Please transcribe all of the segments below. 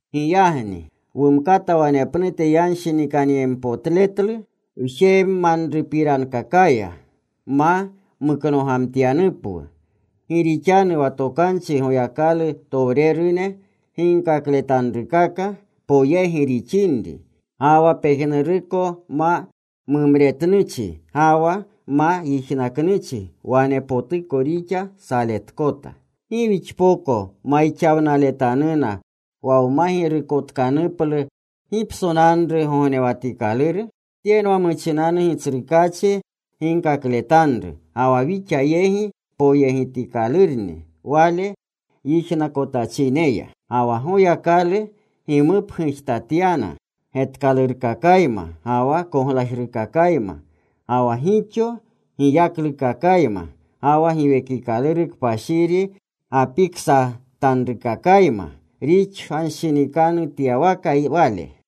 Giyagni wumkata wanepnute yanshinikanyempotletlu wjemanrupirankakaya ma muknogamtyanupwu. Gi rixanu wa tokanchi Goyakalutowrene ginkakletanrukaka poyegi rixinri, ga wa pejnuruko ma mumretnuchi ga wa ma yijnaknuchi wanepotuko rixa saletkota, ¿gi wixpoko mayixawnaletanuna wa wma girukotkanuplu gipsonanru gognewatikaluru? Tyenwa muchinanu Gitsrukaachi ginkakletanru. Ga wa wixa yegi poyegitkalurni Wale yijnakotachineya. Ga wa Goyakalu gimupgujtatyana getkalurkakayma ga wa koglajrukakayma, ga wa gixo giyaklukakayma, ga wa Giwekikaluru Kpashiri gapiksatanrukakayma rixanshinikanutyawaka Wale.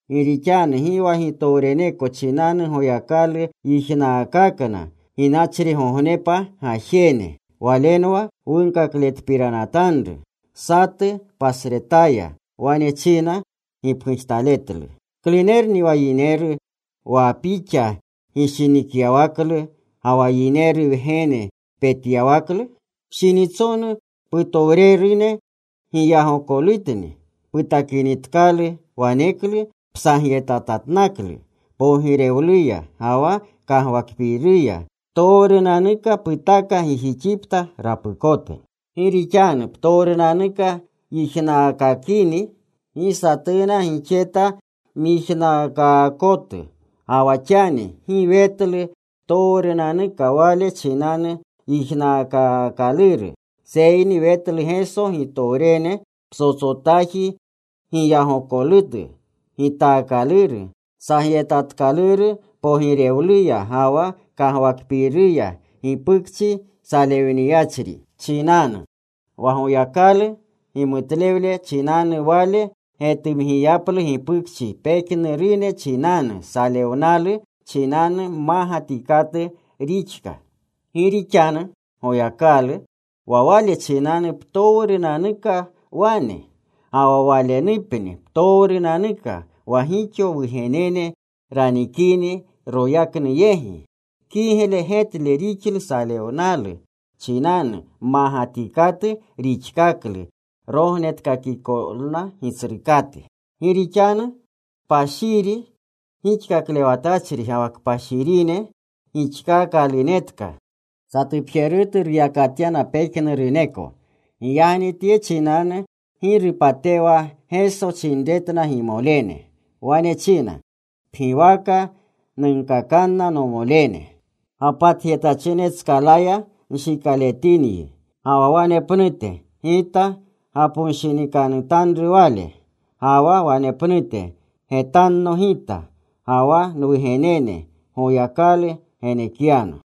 Gi rixanu gi wa gitowreneko chinanu Goyakalu yijnaakakna ginachrigognepa gajene. Walenwa wunkakletpiranatanru. Satu pasretaya wane china gipgujtaletlu: ¿Klunerni wa yineru wa Pixa gishinikyawaklu, ga wa yineru wgene petyawaklu? Pshinitsonu putowrerune giyagokolutni putakinitkalu. Waneklu psagyetatatnaklu pogirewluya ga wa kagwakpiiruya. Ptowrunanuka putaka gijixipta rapukote. Gi rixanu ptowrunanuka yijnaakakini, gi satuna gixeta myijnaakaakotu. Ga wa xani gi wetlu ptowrunanuka Wale chinanu yijnaakaakaluru. Seyni wetlu Geso gitowrene psotsotaji giyagokolutu gitaakaluru, sagyetatkaluru pogirewluya ga wa kagwakpiiruya gipukchi salewniyachri chinanu, wa Goyakalu gimutlewle chinanu Wale getumgiyaplu gipukchi pejnurune chinanu. Salewnalu chinanu mmagatikatu rixka Gi rixanu Goyakalu, wa Wale chinanu ptowrunanuka wane, ga wa Walenupni ptowrunanuka, wa gixo wugenene ranikini royaknu yegi, kigle getle rixlu salewnalu chinanu mmagatikatu rixkaklu rognetkakikolna Gitsrukate. Gi rixanu kpashiri gixkaklewatachri ga wa kpashirine gixkaakalunetka satupjerutu ruyakatyana pejnuruneko. Giyagni tye chinanu gi rupatewa Geso chinretna gimolene. Wane china: Pgiwaka nunkakanna nomolene. Gapatjetachine tskalaya nshikaletinyi. Ga wa wanepnute: Gita gaponshinikanutanru Wale. Ga wa wanepnute: Getanno Gita, ga wa nwugenene Goyakalu genekyano.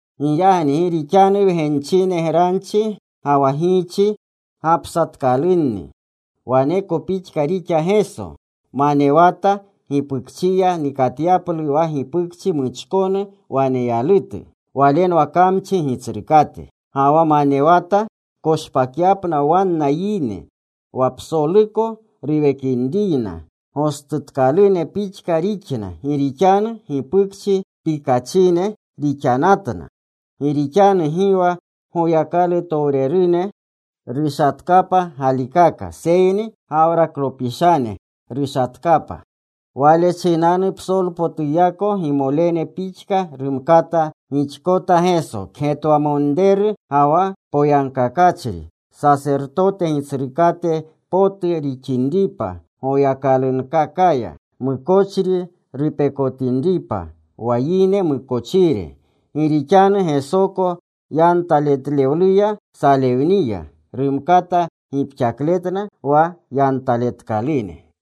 Giyagni gi rixanu wgenchine granchi ga wa giichi gapsatkalunni, waneko pixka rixa Geso. Manewata gipukchiya nikatyaplu wa gipukchi muchkonu waneyalutu. Walenwa kamchi gitsrukate. Ga wa manewata koshpakyapna wanna yine, wa psoluko ruwekinriyna gostutkalune pixka rixna, gi rixanu gipukchi pikachine rixanatna. Gi rixanu gi wa Goyakalutowrerune rushatkapa galikaka, seyni Gawraklopishane rushatkapa. Wale chinanu psolpotuyako gimolene pixka rumkata gixkota Geso, kgetwamonreru ga wa poyagkakachri Sasertote Gitsrukate potu rixinripa Goyakalunkakaya, mukochri rupekotinripa, wa yine mukochire. Gi rixanu Gesoko yantaletlewluya salewniya, rumkata gipxakletna wa yantaletkalune.